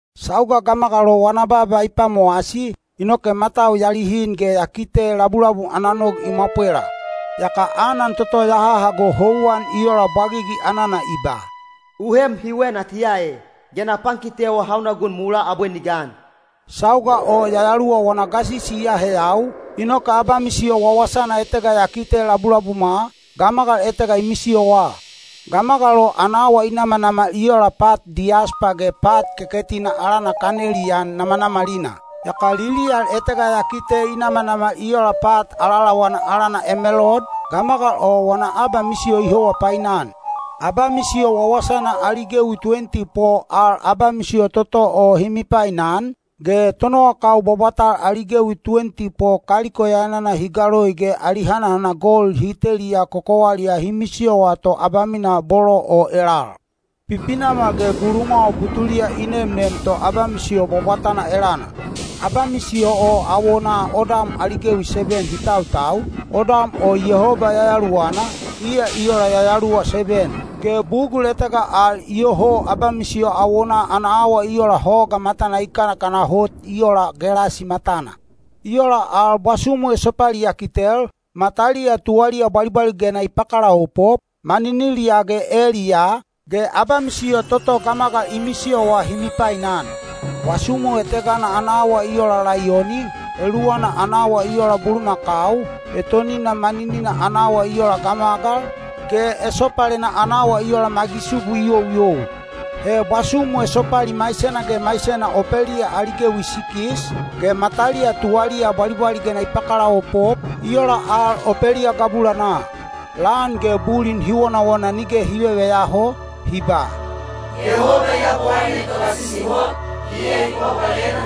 Sauga gamagal o wana baaba i pwamowasi, inoke matau ya lihin ge ya kite labulabum ana nog i mwapwela. Yaka anan toto ya hahago houwan i ola bwagigi anana i ba, “U heem hiwe natiya e, ge na pankitewa hauna gun mulaa abwe ni gan.” Sauga o Yayaluwa wana gasisi i aheyau, inoke abamisiyo wawasana etega ya kite labulabumwa, gamagal etega i misiyowa. Gamagal o ana awa i namanamal i ola pat diyaspa ge pat keketina alana kaneliyan namanamalina. Yaka liliyal etega ya kite i namanamal i ola pat alaalawana alana emelold, gamagal o wana abamisiyo i howa painan. Abamisiyo wawasana ali gewi tuwenti po al abamisiyo toto o hi mipainan, ge tonowakau bwabwatal ali gewi tuwenti po kaliko yayanana hi galoi ge ali hanahana gold hi teliya kokowaliyaa hi misiyowa to abamina bolo o elal. Pipinamal ge gulumwawa butuna i nemnem to abamisiyo bwabwatana elana. Abamisiyo o awonaa odam ali gewi seben hi tautau, odam o Yehoba Yayaluwana, iya i ola yayaluwa seben. Ge bugul etega al iyoho abamisiyo awonaa ana awa i ola hoga matana i kanakana hot i ola gelasi matana. I ola al bwasumu esopali ya kitel, mataliya tuwaliya bwalibwaligena i pakalaopop, maniniliyaa ge eliyaa, ge abamisiyo toto gamagal i misiyowa hi mipainan. Bwasumu etegana ana awa i ola laiyoni, eluwana ana awa i ola bulumakau, etonina maninina ana awa i ola gamagal, ge esopalena ana awa i ola magisubu i youyou. He bwasumu esopali maisena ge maisena opeliya ali gewi sikis, ge mataliya tuwaliya bwalibwaligena i pakalaopop, i ola al opeliya gabulanaa. Lan ge bulin hi wonawona nige hi veveyaho, hi ba, “Yehoba Yabowaine Togasisi Hot, iya i bwabwalena,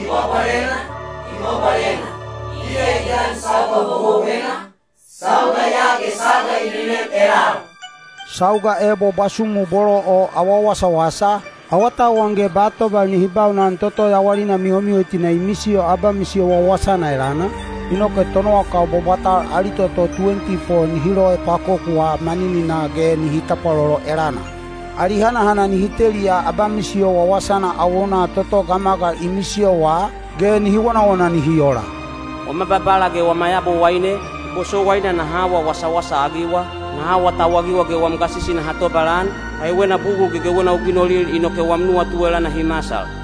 i bwabwalena, i bwabwalena, iya i gan sauga houhouwena, sauga ya ge sauga i nenem elal.” Sauga ebo bwasumu bolo o awa wasawasa, awatauwan ge ba tobal nihi baunan toto yawalina mihomihotina i misiyo abamisiyo wawasana elana, inoke tonowakau bwabwatal ali toto tuwenti po nihi loepwakokuwa manininaa ge nihi tapwalolo elana. Ali hanahana nihi teliya abamisiyo wawasana awonaa toto gamagal i misiyowa, ge nihi wonawona nihi ola, “Wama Babala ge wama Yabowaine, i bosowaina naha awa wasawasa-agiwa, naha awatauwagiwa ge wam gasisi naha tobalan, kaiwena bugul gegewena u ginolil inoke wam nuwatu elana hi masal.”